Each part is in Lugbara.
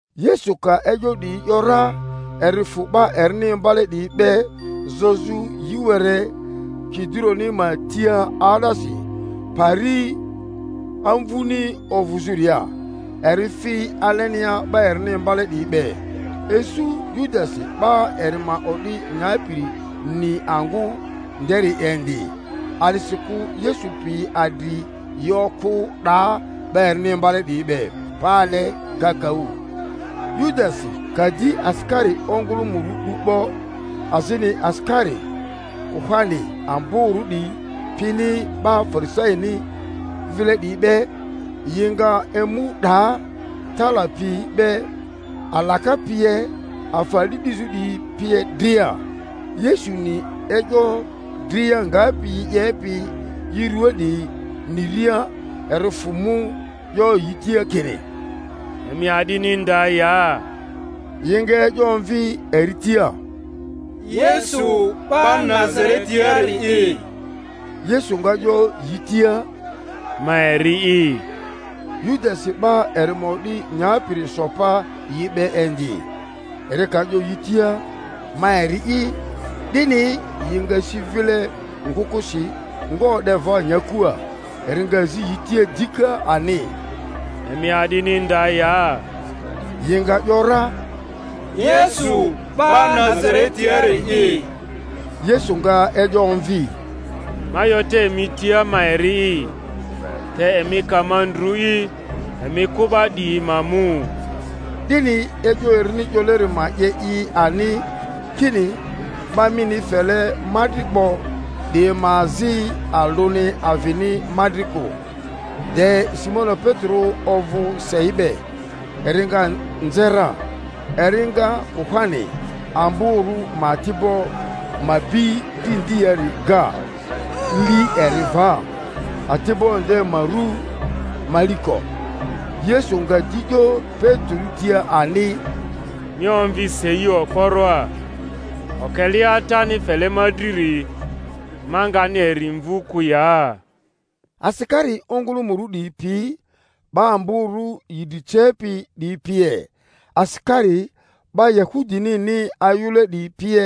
Yesu ka e'yo 'diyi ‘yora, eri fᴜ 'ba erini imbale 'diyi be zozᴜ yi were Kidironi ma tia 'aa'daasi, pari amvuni ovᴜzᴜria, eri fi alenia 'ba erini imbale 'diyi be. Isu Yudasi 'ba eri ma o'di nyapiri ni angᴜ nderi indi; a'disikᴜ Yesu piyi adri yi okᴜ 'daa 'ba erini imbale 'diyi be pale kakaᴜ. Yudasi ka di asikari ongᴜlᴜmᴜrᴜ 'du 'bo, azini asikari kuhani amborᴜ 'diyi pini 'ba Farisaini vile 'diyi be, yi nga emu 'daa tala piyi be, alaka pie, afa a'di 'dizᴜ 'diyi pie dria. Yesuni e'yo dria ngapi yi 'yepi i rᴜaa 'diyi niria, eri fᴜ mu, 'yo yi tia kini, Emi a'dini nda ya? Yi nga e'yo omvi eri tia, Yesu 'ba Nazaretiari'i. Yesu nga 'yo yi tia, Ma eri'i. Yudasi 'ba eri ma o'di nyapiri so pa yi be indi. Eri ka 'yo yi tia, Ma eri'i, 'dini, yi nga si vile ngᴜkᴜsi, nga o'de va nyakua. Eri nga zi yi tia dika ani, Emi a'dini nda ya? Yi nga ‘yora, Yesu 'ba Nazaretiari'i. Yesu nga e'yo omvi, Ma 'yo te emi tia ma eri'i; te emi ka ma ndrᴜ'i, emi kᴜ 'ba 'diyi ma mu. 'Dini e'yo erini 'yoleri ma 'ye i ani, kini, 'Ba mini fele ma dri 'bo 'diyi ma azi alᴜni avini ma dri kᴜ. De Simoni Petero ovᴜ sei be, eri nga nze ra, eri nga kuhani amborᴜ ma ati'bo ma bi dri ndiari ga, li eri va. Ati'bo nde ma rᴜ Maliko. Yesu nga di 'yo Petero tia ani, Mi omvi sei okporoa; okelea Atani fele ma driri, ma ngani eri mvu kᴜ ya? Asikari ongᴜlᴜmᴜrᴜ 'diyi pi 'ba amborᴜ yi dri cepi 'diyi pie, asikari 'ba Yahudinini ayᴜle 'diyi pie,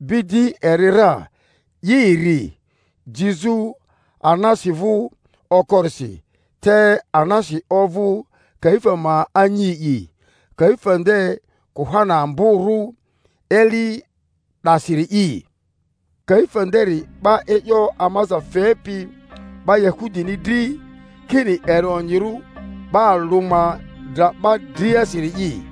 bi di eri ra, 'i eri, jizᴜ Anasi vᴜ okorisi; te Anasi ovᴜ Kaifa ma anyi'i, Kaifa nde kuhani amborᴜ eli 'dasiri'i. Kaifa nderi 'ba e'yo amaza fepi 'ba Yahudini dri, kini eri onyirᴜ 'ba alᴜ ma dra 'ba driasiri’i.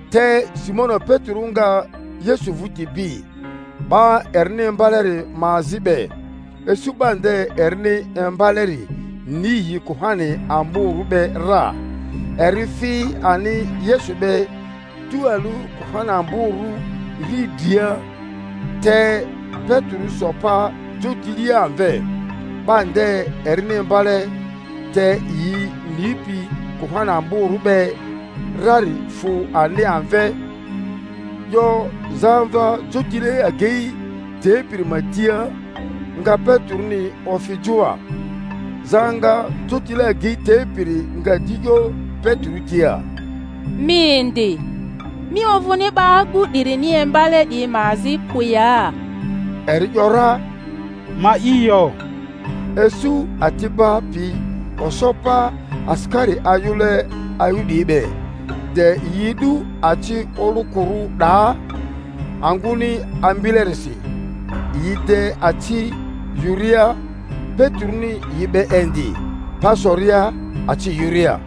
Te Simoni Petero nga Yesu vᴜti bi, 'ba erini imbaleri ma azi be. Isu 'ba nde erini imbaleri ni yi kuhani amborᴜ be ra, eri fi ani Yesu be tualᴜ kuhani amborᴜ riidria, te Petero so pa jotilia amve. 'Ba nde erini imbale, te yi nipi kuhani amborᴜ be rari fᴜ ani amve, 'yo zamva jotile agei tepiri ma tia, nga Peteroni ofi joa. Zaŋa jotile agei tepiri nga di 'yo Petero tia, Mi indi, mi ovᴜni 'ba agu 'dirini imbale 'diyi ma azi kᴜ ya? Eri ‘yora, Ma'i yo. Isu ati'ba piyi oso pa asikari ayᴜle ayᴜ 'diyi be, de yi edᴜ aci olᴜkᴜrᴜ 'daa angᴜni ambilerisi, yi de aci yᴜria; Peteroni yi be indi, pa soria aci yᴜria.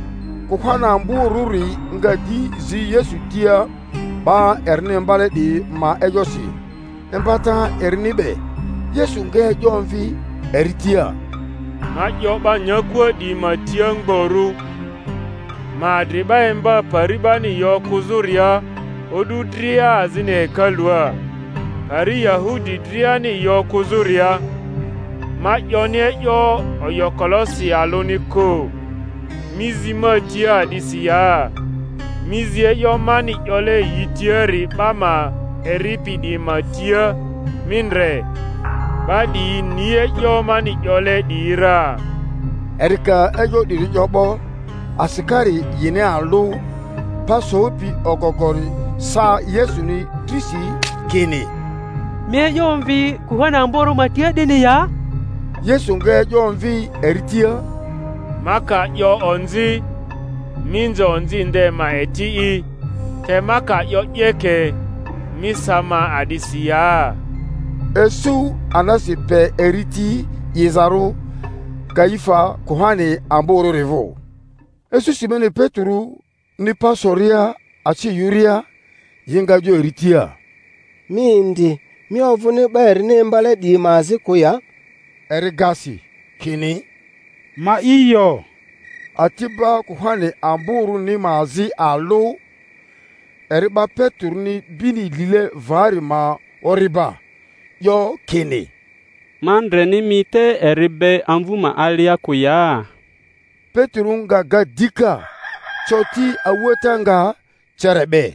Kuhani amborᴜri nga di zi Yesu tia 'ba erini imbale 'diyi ma e'yosi, imbata erini be. Yesu nga e'yo omvi eri tia, Ma 'yo 'ba nyakua 'diyi ma tia mgborᴜ; ma adri 'ba imba pari 'bani yi okᴜzᴜria o'du dria azini hekalua, pari Yahudi driani yi okᴜzᴜria; ma 'yoni e'yo oyokolosi alᴜni kᴜ. Mi zi ma tia a'disi ya? Mi zi e'yo mani 'yole yi tiari 'ba ma eripi 'diyi ma tia; mi ndre, 'ba 'diyi ni e'yo mani 'yole 'diyi ra. Eri ka e'yo 'diri 'yo 'bo, asikari yini alᴜ pa sopi ogogori sa Yesuni drisi, kini, Mi e'yo omvi kuhani amborᴜ ma tia 'dini ya? Yesu nga e'yo omvi eri tia, Ma ka 'yo onzi, mi nze onzi nde ma eti'i; te ma ka 'yo 'yeke, mi sa ma a'disi ya? Isu Anasi pe eri ti 'izarᴜ Kaifa kuhani amborᴜri vᴜ. Isu Simoni Peteroni pa soria aci yᴜria. Yi nga 'yo eri tia, Mi indi, mi ovᴜni 'ba erini imbale 'diyi ma azi kᴜ ya? Eri ga si, kini, Ma'i yo. Ati'ba kuhani amborᴜni ma azi alᴜ, eri 'ba Peteroni bini lile vari ma ori'ba, 'yo kini, Ma ndreni mi te eri be amvᴜ ma alia kᴜ ya? Petero nga ga dika; coti a'uata nga cere 'be.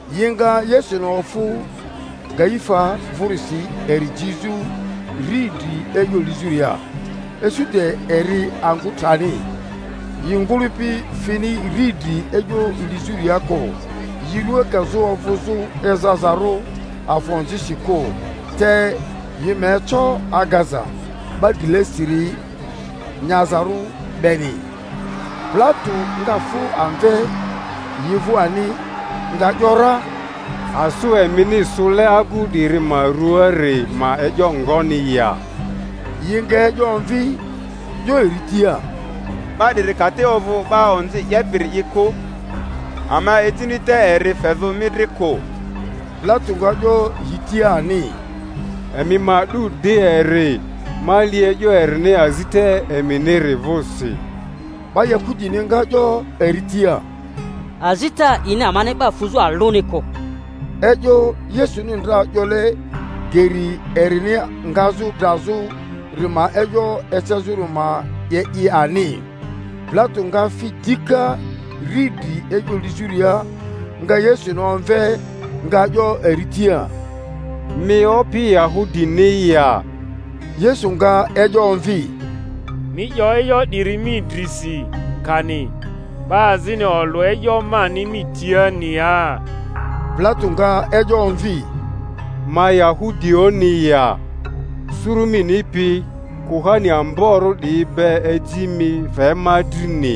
Yi nga Yesuni ofᴜ Kaifa vᴜrisi eri jizᴜ riidri e'yo lizᴜria. Isu de eri angᴜ trani. Yi ngᴜlᴜpi fini riidri e'yo lizᴜria kᴜ, yi rua kazᴜ ovᴜzᴜ ezazarᴜ afa onzisi kᴜ, te yi ma eco agaza 'ba drilesiri nyazarᴜ beni. Pilato nga fᴜ amve yi vᴜ ani, nga ‘yora, Asᴜ emini sᴜle agᴜ 'diri ma rᴜaari ma e'yo ngoni ya? Yi nga e'yo omvi, 'yo eri tia, 'Ba 'diri ka te ovᴜ 'ba onzi 'yepi'iri kᴜ, ama ejini te eri fezᴜ mi dri kᴜ. Pilato nga 'yo yi tia ani, Emi ma 'du di eri, ma li e'yo erini azita eminiri vᴜsi. 'Ba Yahudini nga 'yo eri tia, Azita a'ini amani 'ba fuzᴜ alᴜni kᴜ. E'yo Yesuni ndra 'yole geri erini ngazᴜ drazᴜri ma e'yo ecezᴜri ma 'ye i ani. Pilato nga fi dika riidri e'yo lizᴜria, nga Yesuni omve, nga 'yo eri tia, Mi Opi Yahudini ya? Yesu nga e'yo omvi, Mi 'yo e'yo 'diri mi drisi, kani 'ba azini olᴜ e'yo mani mi tiani ya? Pilato nga e'yo omvi, Ma Yahudioᴜni ya? Suru mini pi kuhani amborᴜ 'diyi be eji mi fe ma drini;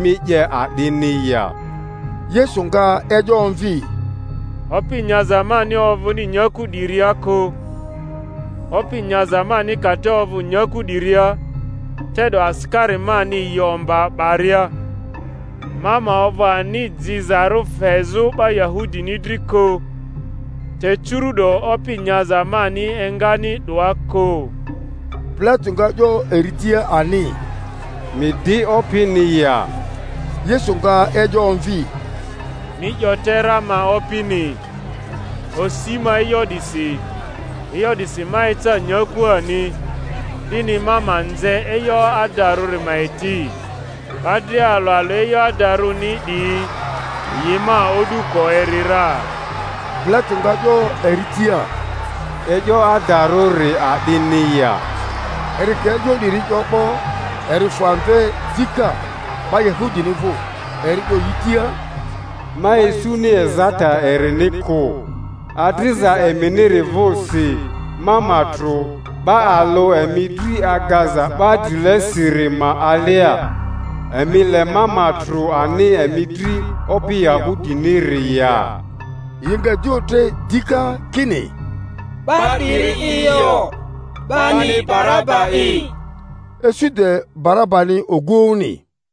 mi 'ye a'dini ya? Yesu nga e'yo omvi, Opi nyaza mani ovᴜni nyaku 'diria kᴜ; opi nyaza mani ka te ovᴜ nyaku 'diria, te'do asikari mani yi omba 'baria, ma ma ovᴜ ani jizarᴜ fezᴜ 'ba Yahudini dri kᴜ; te curu'do opi nyaza mani engani 'doa kᴜ. Pilato nga 'yo eri tia ani, Mi di opini ya? Yesu nga e'yo omvi, Mi 'yo te ra ma opini. Osi ma e'yo 'disi, e'yo 'disi ma eca nyakua ani, 'dini ma ma nze e'yo adarᴜri ma eti. 'Ba dria alᴜ alᴜ e'yo adarᴜni 'diyi yi ma o'duko eri ra. Pilato nga 'yo eri tia, E'yo adarᴜri a'dini ya? Eri ka e'yo 'diri 'yo 'bo, eri fᴜ amve dika 'ba Yanudini vᴜ, eri 'yo yi tia, Ma isuni ezata erini kᴜ. Adriza eminiri vᴜsi ma ma trᴜ 'ba alᴜ emi dri agaza 'ba drilesiri ma alia; emi le ma ma trᴜ ani emi dri Opi Yahudiniri ya? Yi nga di otre dika kini, 'Ba 'diri'i yo, bani Baraba'i! Isu de Barabani ogᴜoᴜni.